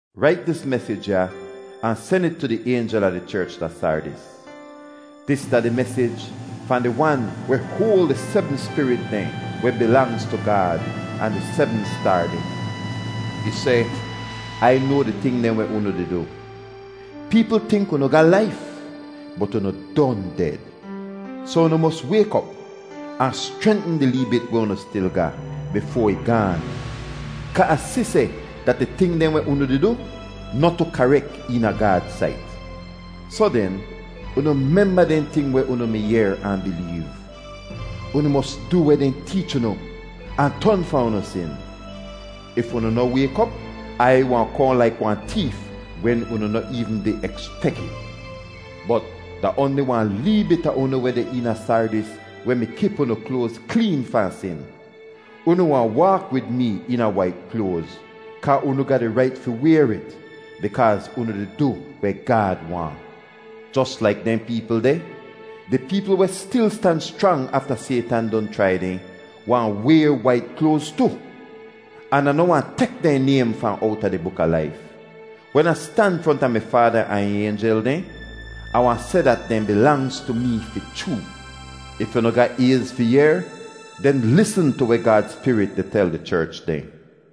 “Rait dis mesij ya ahn sen it tu di aynjel a di cherch da Sardis: Dis da di mesij fahn di Wan weh hoal di sebm spirit dehn weh bilangz tu Gaad ahn di sebm staar dehn. Ih seh: Ai noa di ting dehn weh unu di du. Peepl tink unu ga laif, bot unu don ded! Soh unu mos wayk op ahn schrentn di lee bit weh unu stil ga, bifoa ih gaan. Kaa Ah si seh dat di ting dehn weh unu di du noh tu karek eena Gaad sait. Soh den, unu memba dehn ting weh unu mi yehr ahn bileev. Unu mos du weh dehn teech unu ahn ton fahn unu sin. If unu noh wayk op, Ai wahn kohn laik wahn teef wen unu noh eevn di ekspek it. Bot, da oanli wahn lee bit a unu weh deh eena Sardis weh mi kip unu kloaz kleen fahn sin. Unu wahn waak wid mee eena wait kloaz, kaa unu ga di rait fi wayr it, bikaaz unu di du weh Gaad waahn. Jos laik dehn peepl deh, di peepl weh stil stan schrang afta Saytan don chrai dehn wahn wayr wait kloaz tu. An Ah noh wahn tek dehn naym fahn owta di buk a laif. Wen Ah stan fronta mi Faada ahn ih aynjel dehn, Ah wahn seh dat dehn bilangz tu mee fi chroo. If unu ga ayz fi yehr, den lisn tu weh Gaad Spirit di tel di cherch dehn.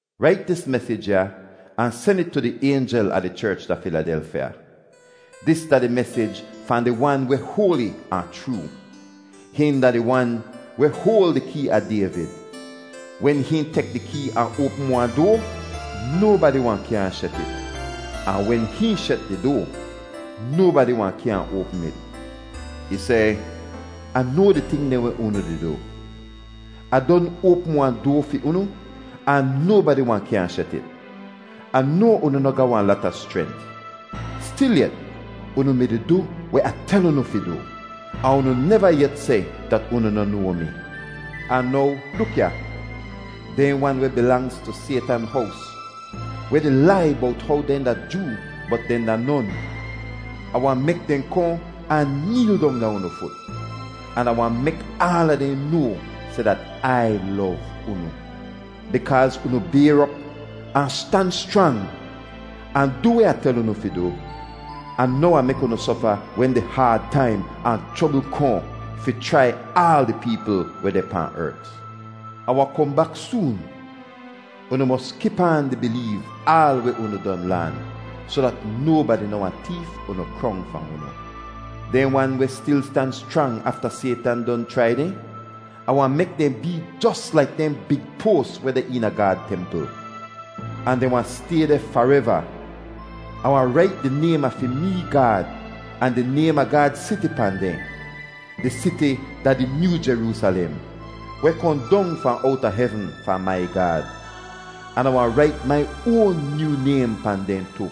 “Rait dis mesij ya ahn sen it tu di aynjel a di cherch da Filadelfya: Dis da di mesij fahn di Wan weh hoali ahn chroo. Hihn da di Wan weh hoal di kee a Dayvid. Wen hihn tek di kee ahn oapm wahn doa, nobadi wahn kyaahn shet it. Ahn wen hihn shet di doa, nobadi wahn kyaahn oapm it. Ih seh: Ah noa di ting dehn weh unu di du! Ah don oapm wahn doa fi unu, ahn nobadi wahn kyaahn shet it. Ah noa unu noh ga wahn lata schrent. Stilyet, unu mi-di du weh Ah tel unu fi du, ahn unu neva yet seh dat unu noh noa mi. Ahn now luk ya! Dehn wan weh bilangz tu Saytan hows, weh di lai bowt how dehn da Joo bot dehn da non, Ah wahn mek dehn kohn ahn neel dong da unu fut, an Ah wahn mek aala dehn noa seh dat Ai lov unu. Bikaaz unu bayr op ahn stan schrang, ahn du weh Ah tel unu fi du, Ah noh wahn mek unu sofa wen di haad taim ahn chrobl kohn fi chrai aal di peepl weh deh pahn ert. Ah wahn kohn bak soon. Unu mos kip aan di bileev aal weh unu don laan, soh dat nobadi noh wahn teef unu krong fahn unu. Dehn wan weh stil stan schrang afta Saytan don chrai dehn, Ah wahn mek dehn bee jos laik dehn big poas weh deh eena Gaad templ. Ahn dehn wahn stay deh fareva. Ah wahn rait di naym a fi mee Gaad ahn di naym a Gaad siti pahn dehn. Dis siti da di nyoo Jeroosalem, weh kohn dong fahn owta hevn fahn mai Gaad. An Ah wahn rait mai oan nyoo naym pahn dehn tu.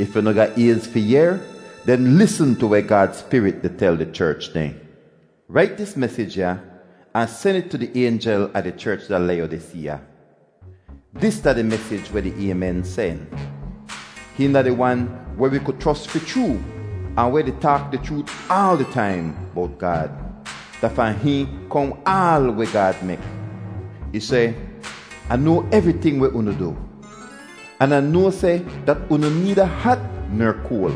If unu ga ayz fi yehr, den lisn tu weh Gaad Spirit di tel di cherch dehn. “Rait dis mesij ya ahn sen it tu di aynjel a di cherch da Layodiseeya. Dis da di mesij weh di Aymen sen. Hihn da di Wan weh wi ku chros fi chroo ahn weh di taak di chroot aal di taim bowt Gaad. Da fahn Hihn kohn aal weh Gaad mek. Ih seh: Ah noa evriting weh unu du, an Ah noa seh dat unu needa hat ner koal.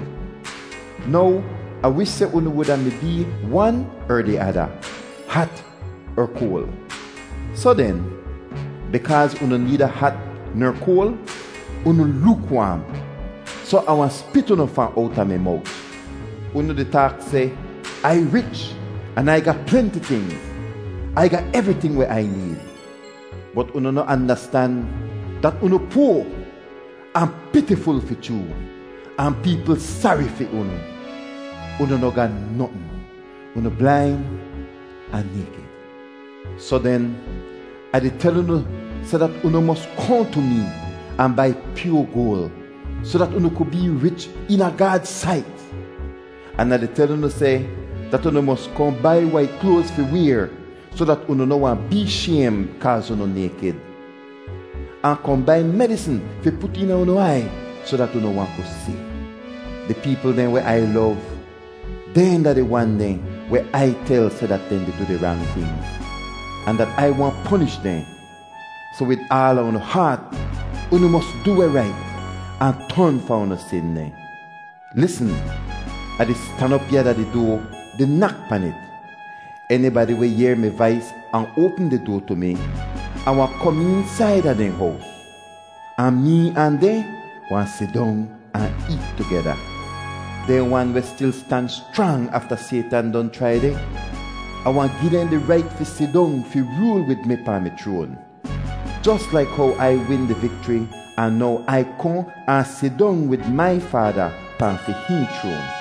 Now Ah wish seh unu wuda mi bee wan er di ada, hat er koal. Soh den, bikaaz unu needa hat ner koal, unu lookwaam, soh Ah wahn spit unu fahn owta mi mowt! Unu di taak seh, ‘Ai rich, an Ai ga plenti tingz. Ai ga evriting weh Ai need.’ Bot unu noh andastan dat unu poa ahn pitiful fi chroo, ahn peepl sari fi unu. Unu noh ga notn! Unu blain ahn naykid. Soh den, Ah di tel unu seh dat unu mos kohn tu mee ahn bai pyoa goal, soh dat unu ku bee rich eena Gaad sait. An Ah di tel unu seh dat unu mos kohn bai wait kloaz fi wayr soh dat unu noh wahn bee shaym kaaz unu naykid. Ahn kohn bai medisn fi put eena unu aiy soh dat unu wahn ku si. Di peepl dehn weh Ai lov, dehn da di wan dehn weh Ai tel seh dat dehn di du di rang tingz, ahn dat Ai wahn ponish dehn. Soh wid aala unu haat unu mos du weh rait, ahn ton fahn unu sin dehn. Lisn! Ah di stan op ya da di doa, di nak pan it. Enibadi weh yehr mi vais ahn oapm di doa tu mi, Ah wahn kom eensaida dehn hows. Ahn mee ahn dehn wahn sidong ahn eet tugeda. Dehn wan weh stil stan schrang afta Saytan don chrai dehn, Ah wahn gi dehn di rait fi sidong fi rool wid mi pahn mi chroan, jos laik how Ai win di vikchri ahn now Ai kohn ahn sidong wid mai Faada pahn fi hihn chroan.